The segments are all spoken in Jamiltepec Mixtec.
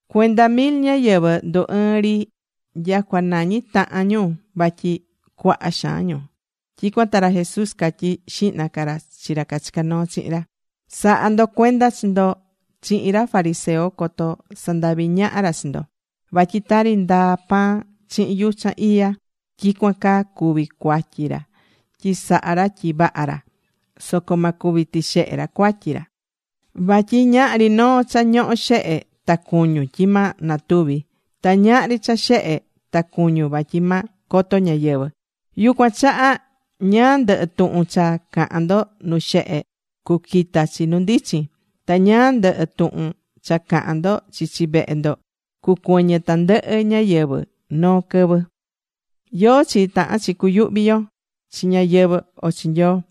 Cuenda mil ñáyɨvɨ ndu ɨɨ̱n ri nyacua nañi tahan ñu, vatyi cuaha xaan ñu. Tyicuan ta ra Jesús catyí xihna ca ra chi ra cachicá noo chihin ra: ―Sa̱ha ndo cuenda chi ndo chihin ra fariseo coto sandahvi ñaha ra chi ndo. Vatyi tari ndaa pan chihin yuchan iya, tyicuan caa cuví cuatyi ra tyi sahá ra tyi vaha ra. Soco ma cuvi tixehe ra cuatyi ra. Vatyi ñahri noo cha ñohó xehe ta cuñún, tyi ma natuvi, ta ñahri cha xehe ta cuñun, vatyi ma coto ñáyɨvɨ. Yucuan chaha ñáá ndɨhɨ tuhun cha cahán ndo nu xehe, cuquita chi nu ndichin. Ta ñáá ndɨhɨ tuhun cha cahan ndo chichi vehe ndo, cucuɨñɨ tandɨhɨ ñáyɨvɨ noo quɨvɨ. ¿Yóó chi tahán chi cuyuhvi yo, chi ñáyɨvɨ o chi Nyoo?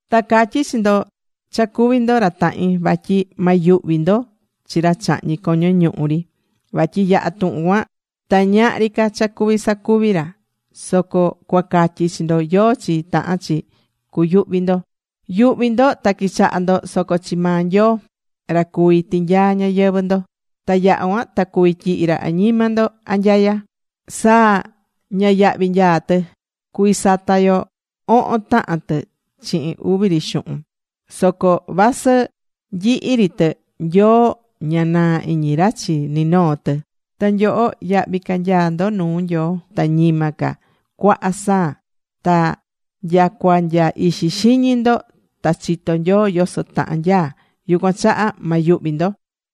’Ta catyí chi ndo cha cuví ndo ra tahin, vatyi ma yuhvi ndo chi ra chahñí coño ñuhu ri. Vatyi yaha̱ tuhun cuan ta ñahri ca cha cuví sacuvi ra. Soco cua catyi chi ndo yóó chi tahán chi cuyuhvi ndo. Yu̱hvi ndo ta qui̱chaha ndo, soco chi maa Nyoo ra cuví tinyaa ñayɨvɨ̱ ndo. Ta yaha cuan ta cuví tyihi ra añima ndo anyaya. ’Saa, ña yahvi nyaá tɨ. Cuví sata yo ohon tahan tɨ chihin uvi ri xuhun. Soco vasɨ nyihi ri tɨ, Nyoo ña naa iñi ra chi ni noo tɨ. Ta nyoho, yahvi ca nyaá ndo nu Nyoo ta ñima ca cuaha saa ta nyacua nya ixi xiñi ndo ta chitó Nyoo yoso tahan nyaá. Yucuan chaha ma yuhvi ndo.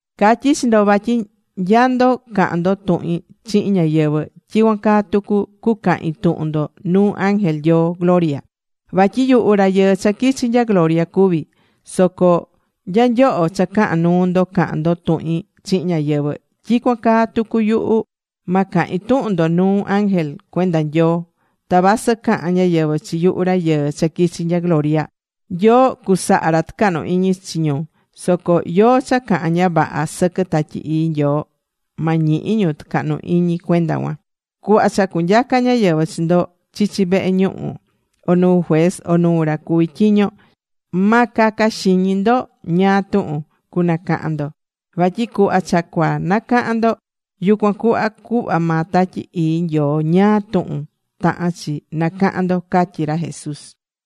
’Catyí chi ndo vatyi nya ndo cahán ndo tuhin chihin ñáyɨvɨ, tyicuan caa tucu cucahin tuhun ndo nuu ángel Nyoo gloria. Vatyi yuhu Rayɨɨ cha quichi nya gloria cuví. Soco nya nyoho cha cahán nuu ndo cahán ndo tuhin chihin ñáyɨvɨ, tyicuan caa tucu yuhu, ma cahin tuhun ndo nuu ángel cuenda Nyoo. Ta vasɨ cahán ñáyɨvɨ chi yuhu Rayɨɨ cha quichi̱ nya gloria, Nyoo cusaha ra tucahnu iñi chi ñu. Soco yóó cha cahán ña vaha sɨquɨ Tatyi Ii Nyoo ma ñihi ñu tucahnu iñi cuenda cuan. ’Cuhva cha cunyaca ñáyɨvɨ chi ndo chichi vehe ñuhu, o nu juez, o nuu ra cuví tyiño, ma caca xiñi ndo ñáá tuhun cunacahan ndo. Vatyi cuhva cha cua nacahan ndo, yucuan cuhva cuhva maa Tatyi Ii Nyoo ñáá tuhun tahán chi nacahan ndo ―catyí ra Jesús.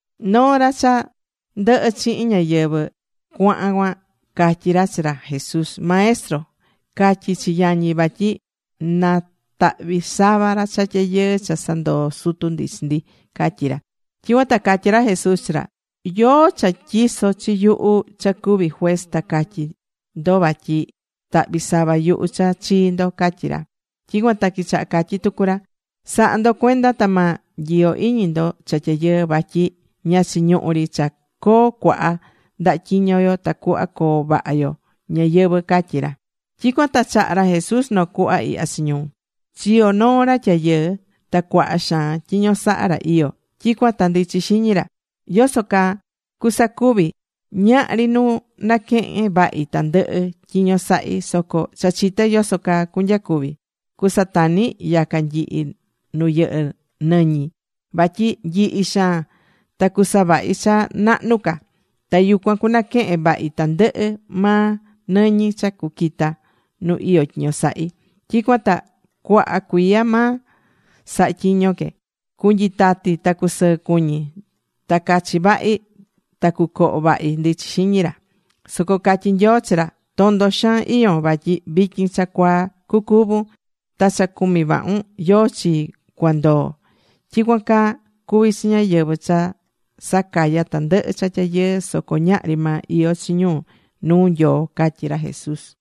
Noo ra cha ndɨhɨ chihin ñáyɨvɨ cuaha cuan, catyí ra chi ra Jesús: ―Maestro, ca̱tyi chi yañi vatyi natahvi sava ra cha tyayɨɨ cha sandoo sutu ndi chi ndi ―catyí ra. Tyicuan ta catyí ra Jesús chi ra: ―¿Yóó cha tyiso chi yuhu cha cuví juez ta catyi ndo vatyi tahvi sava yuhu cha chii ndo? ―catyí ra. Tyicuan ta quichaha catyí tucu ra: ―Sa̱ha ndo cuenda ta ma nyiyo iñi ndo cha tyayɨɨ. Vatyi ña chiñuhú ri cha coo cuaha ndaha tyiño yo tacuhva coo vaha yo ñayɨvɨ̱ ―catyí ra. Tyicuan ta chaha̱ ra Jesús noo cuhva ihya chi ñu: ―Chiyo̱ noo ra tyayɨɨ. Ta cuaha xaan tyiño sahá ra iyó. Tyicuan ta ndichi xiñi ra: “¿Yoso caa cusacuvi? Ñahri nu naquehen vahi tandɨhɨ tyiño sahi. Soco cha chité yoso caa cunyacuvi. Cusatani yaca nyihi nu yɨhɨ́ nɨñi, vatyi nyihi xaan. Ta cusavahi cha nahnu ca. Ta yucuan cunaquehen vahi tandɨhɨ maa nɨñi cha cuquita nu iyó tyiño sahí. Tyicuan ta cuaha cuiya ma saha tyiño que. Cunyitati ta cusɨɨ cuñi. Ta cachi vahi. Ta cucoho vahi”, ndichi xiñi ra. Soco catyí Nyoo chi ra: “Tondo xaan iyón. Vatyi vityin cha cuaa cucúvun. Ta cha cumí vahun ¿yóó chi cua ndoo?” Tyicuan caa cuvi chi ñáyɨvɨ cha sacayá tandɨhɨ cha tyayɨɨ soco ñahri maa iyó chi ñu nuu Nyoo ―catyí ra Jesús.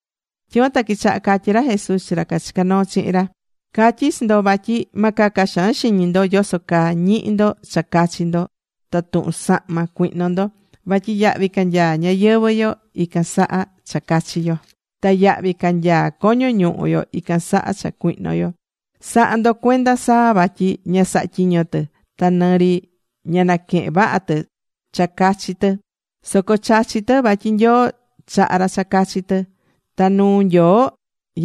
Tyicuan ta quichaha catyí ra Jesús chi ra cachicá noo chihin ra: ―Catyí chi ndo, vatyi ma caca xaan xiñi ndo yoso caa ñihi ndo cha cachi ndo, ta tuhun sahma cuihno ndo. Vatyi yahvi ca nyaá ñayɨvɨ̱ yo ican saha cha cachi yo. Ta yahvi ca nyaá coño ñuhu yo ican saha cha cuihno yo. Sa̱ha ndo cuenda saa vatyi ña sahá tyiño tɨ. Ta nɨ ri ña naquehén vaha tɨ cha cachi tɨ. Soco chachí tɨ, vatyi Nyoo chahá ra cha cachi tɨ. Ta nuu Nyoo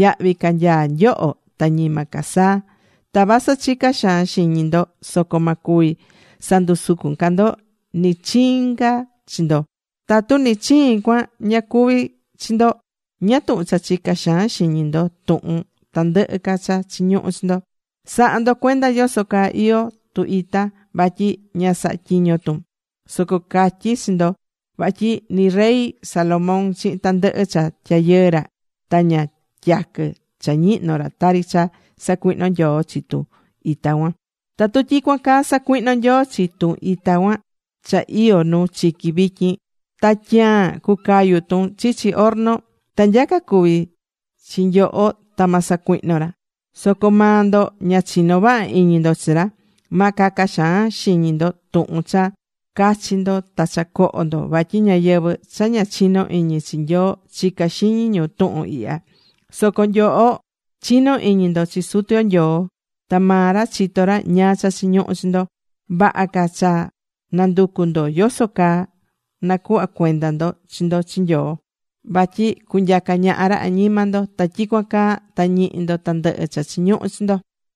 yahvi ca nyaá nyoho ta ñima ca saa. Ta vasɨ chicá xaan xiñi ndo soco ma cuvi sandusucun ca ndo nɨ chiin ca chi ndo. Tatu nɨ chiin cuan ña cuví chi ndo, ¿ñáá tuhun cha chicá xaan xiñi ndo tuhun tandɨhɨ ca cha chiñuhu chi ndo? ’Sa̱ha ndo cuenda yoso caa iyó tu ita vatyi ña sahá tyiño tun. Soco catyí chi ndo vatyi ni rey Salomón chihin tandɨhɨ cha tyayɨɨ ra ta ña tyaquɨ cha ñihnó ra tari cha sacuihno Nyoo chi tu ita cuan. Tatu tyicuan caa sacuihnó Nyoo chi tun ita cha iyó nu chiqui vityin, ta tyaan cucayu tun chichi horno, ta nyaca cuví chi nyoho ta ma sacuihno ra. Soco maa ndo ña chinó vaha iñi ndo chi ra. Ma caca xaan xiñi ndo tuhun cha cachi ndo ta cha coho ndo. Vatyi ñáyɨvɨ cha ña chinó iñi chi Nyoo chicá xiñi ñu tuhun ihya. Soco nyoho chinó iñi ndo chi Sutu yo Nyoo ta maa ra chitó ra ñáá cha chiñuhú chi ndo. Vaha ca cha nanducu ndo yoso caa nacuhva cuenda ndo chi ndo chi Nyoo vatyi cunyaca ñaha ra añima ndo. Ta tyicuan caa ta ñihi ndo tandɨhɨ cha chiñuhú chi ndo.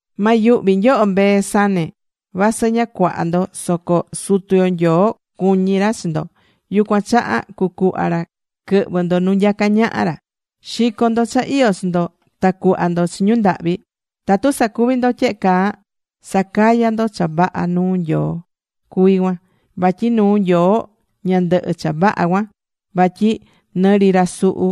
’Ma yuhvi nyoho, mbee sane. Vasɨ ña cuaha ndo soco Sutu yo Nyoo cuñí ra chi ndo. Yucuan chaha cucuhva ra quɨhvɨ ndo nu nyacá ñaha ra. Xi̱co ndo cha iyó chi ndo. Ta cu̱hva ndo chi ñu ndahvi. Tatu sacuví ndo tyehe caa, sacayá ndo cha vaha nuu Nyoo cuví cuan. Vatyi nuu Nyoo ña ndɨhɨ́ cha vaha cuan. Vatyi nɨ ri ra suhu,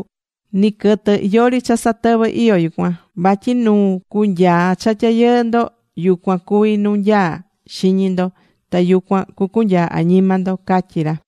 ni quɨtɨ, yori cha satɨvɨ iyó yucuan. Vatyi nuu cunyaa cha tyayɨɨ ndo, yucuan cuví nu nyaá xiñi ndo. Ta yucuan cucunyaa añima ndo ―catyí ra.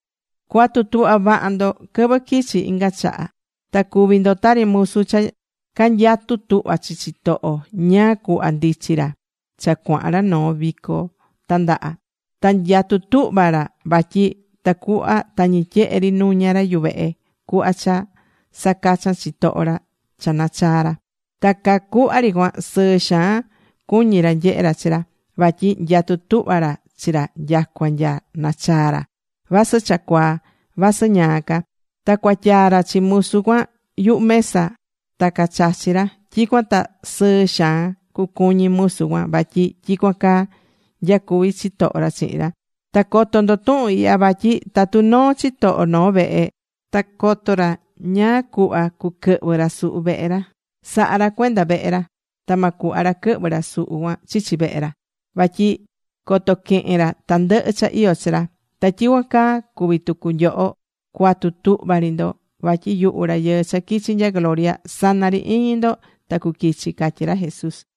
’Cua̱tu tuhva vaha ndo quɨvɨ quichi inga chaha. Ta cu̱vi ndo tari musu cha canyatú tuhva chi chitoho ñáá cuhva ndichi ra cha cuahan ra noo vico tandaha. Ta nyatú tuhva ra, vatyi tacuhva tañi tyehe ri nuña ra yuvehe cuhva cha sacachan chitoho ra cha nachaa ra. Ta caa cuhva ri cuan sɨɨ xaan cuñí ra nyehe ra chi ra. Vatyi nyatú tuhva ra chi ra nyacua nya nachaa ra, vasɨ cha cuaa, vasɨ ñaa ca. Ta cuatyaa ra chi musu cuan yuhu mesa ta cacachi ra. Tyicuan ta sɨɨ xaan cucuñi musu cuan. Vatyi tyicuan caa nyacuví chitoho ra chihin ra. Ta co̱to ndo tuhun ihya vatyi tatu noo chitoho noo vehe, ta coto ra ñáá cuhva cuquɨhvɨ ra suhu vehe ra, saha ra cuenda vehe ra. Ta ma cuhva ra quɨhvɨ ra suhu cuan chichi vehe ra. Vatyi coto quehen ra tandɨhɨ cha iyó chi ra. Ta tyicuan caa cuví tucu nyoho, cua̱tu tuhva ri ndo. Vatyi yuhu Rayɨɨ cha quichi nya gloria, sana ri iñi ndo ta cuquichi ―catyí ra Jesús.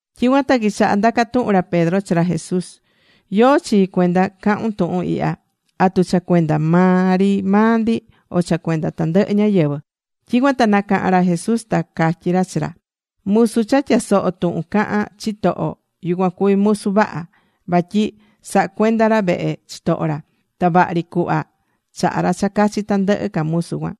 Tyicuan ta quichaha ndaca tuhun ra Pedro chi ra Jesús: ―¿Yóó chi cuenda cahun tuhun ihya? ¿Atu cha cuenda maa ri maa ndi, o cha cuenda tandɨhɨ ñáyɨvɨ? Tyicuan ta nacaha̱n ra Jesús, ta catyí ra chi ra: ―Musu cha tyasohó tuhun cahán chitoho, yucuan cuví musu vaha. Vatyi sahá cuenda ra vehe chitoho ra. Ta vaha ri cuhva chahá ra cha cachi tandɨhɨ ca musu cuan.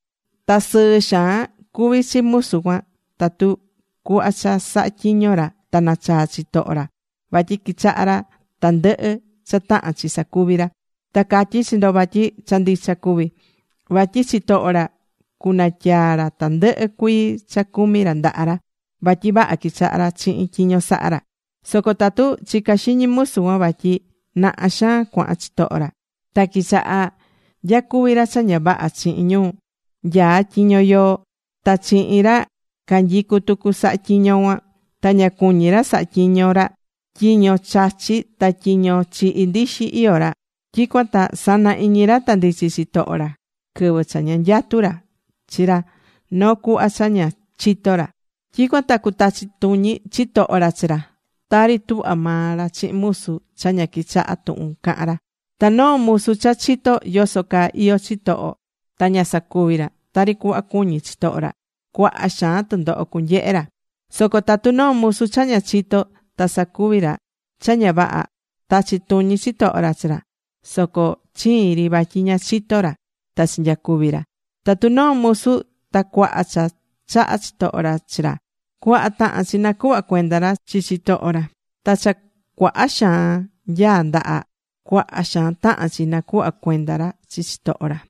Ta sɨɨ xaan cuví chi musu cuan tatu cuhva cha sahá tyiño ra, ta nachaa chitoho ra. Vatyi quichaha ra tandɨhɨ cha tahán chi sacuvi ra. Ta catyí chi ndo vatyi cha ndicha cuví. Vatyi chitoho ra cunatyaa ra tandɨhɨ cuii cha cumí ra ndaha ra. Vatyi vaha quichahá ra chihin tyiño sahá ra. Soco tatu chicá xiñi musu cuan vatyi naha xaan cuahan chitoho ra, ta quichaha nyacuvi ra cha ña vaha chihin ñu nyaá tyiño yoo, ta chihin ra canyicú tucu sahá tyiño cuan. Ta ña cuñí ra sahá tyiño ra. Tyiño chachí ta tyiño chihí ndixi iyó ra. Tyicuan ta sana iñi ra ta ndichi chitoho ra quɨvɨ cha ña nyatú ra chi ra noo cuhva cha ña chito ra. Tyicuan ta cutachi tuñi chitoho ra chi ra, tari tuhva maa ra chihin musu cha ña quichahá tuhun cahán ra. ’Ta noo musu cha chitó yoso caa iyó chitoho ta ña sacuvi tari cuhva cuñi chitoho ra, cuaha xaan tundoho cunyehe ra. Soco tatu noo musu cha ña chitó ta sacuvi ra cha ña vaha, tachi tuñi chitoho ra chi ra. Soco chiin ri, vatyi ña chitó ra, ta chinyacuvi̱ ra. Tatu noo musu ta cuaha cha chaha chitoho ra chi ra, cuaha tahán chi nacuhva cuenda ra chi chitoho ra. Ta ra cha cuaha xaan nyaá ndaha, cuaha xaan tahán chi nacuhva cuenda ra chi chitoho ra.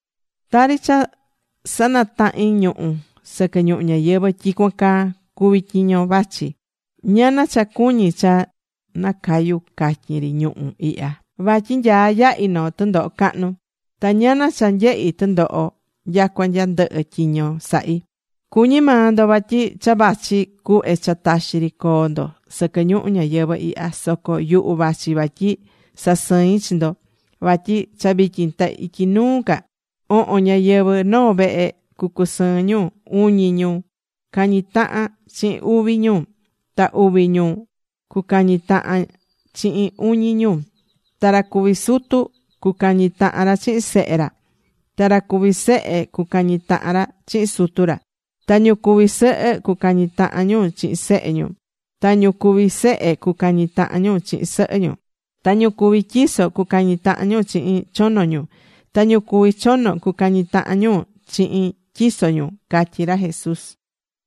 ’Tari cha sanatahín ñuhu̱ sɨquɨ ñuhu ñayɨvɨ̱, tyicuan caa cuví tyiño vachi. ¡Ñana cha cuñí cha nacayu catyin ri ñuhu̱ ihya! Vatyi nyaá yahi noo tundoho cahnu, ta ñana cha nyehí tundoho nyacua nya ndɨhɨ tyiño sahí. Cuñí maa ndo vatyi cha vachi cuhve cha taxi ri coo ndo sɨquɨ ñuhu ñayɨvɨ̱ ihya. Soco yuhu vachi vatyi sasɨin chi ndo. Vatyi cha vityin ta ityi nuu ca, ohon ñáyɨvɨ noo vehe cucusɨɨn ñu. Uñi ñu cañi tahan chihin uvi ñu. Ta uvi ñu cucañi tahan chihin uñi ñu. Ta ra cuví sutu, cucañi tahan ra chihin sehe ra. Ta ra cuví sehe cucañi tahan ra chihin sutu ra. Ta ñu cuví sɨhɨ cucañi tahan ñu chihin sehe ñu. Ta ñu cuvi sehe cucañi tahan ñu chihin sɨhɨ ñu. Ta ñu cuví tyiso cucañi tahan ñu chihin chono ñu. Ta ñu cuví chono cucañi tahan ñu chihin tyiso ñu ―catyí ra Jesús.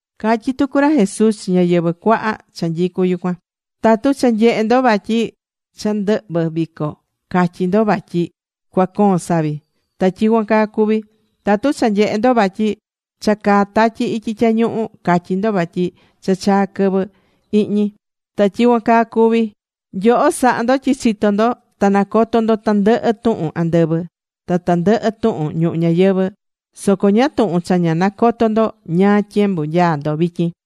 Catyí tucu ra Jesús chi ñáyɨvɨ cuaha cha nyicú yucuan: ―Tatu cha nyehe ndo vatyi cha ndɨhvɨ̱ vico, catyí ndo vatyi cua coon savi. Ta tyicuan caa cuví. Tatu cha nyehe ndo vatyi cha caá tatyi ityi tyañuhu, catyi ndo vatyi cha chaa quɨvɨ ihñi. Ta tyicuan caa cuví. Nyoho sahá ndo tyi chitó ndo, ta nacotó ndo tandɨhɨ tuhun andɨvɨ, ta tandɨhɨ tuhun ñuhu ñayɨvɨ̱. Soco ¿ñáá tuhun cha ña nacotó ndo ñáá tyembu nyaá ndo vityin?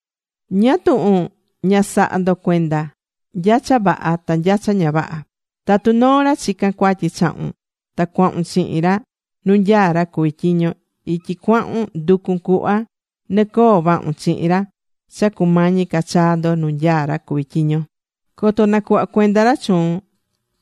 ’¿Ñáá tuhun ña sahá ndo cuenda nya cha vaha ta nya cha ña vaha? Tatu noo ra chicán cuatyi chahun ta cuahun chihin ra nu nyaá ra cuví tyiño, ityi cuahun ndu̱cun cuhva nɨ coo vahun chihin ra cha cumañi ca chaa ndo nu nyaá ra cuví tyiño. Coto nacuhva cuenda ra chuun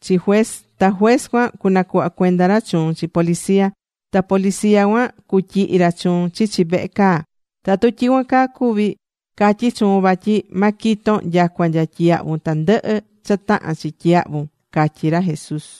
chi juez. Ta juez cuan cunacuhva cuenda ra chuun chi policía. Ta policía cuan cutyihi ra chuun chichi vehe caa. Tatu tyicuan caa cuvi, catyí chuun vatyi ma quiton nyacua nya tyiyahvun tandɨhɨ cha tahán chi tyiyahvun ―catyí ra Jesús.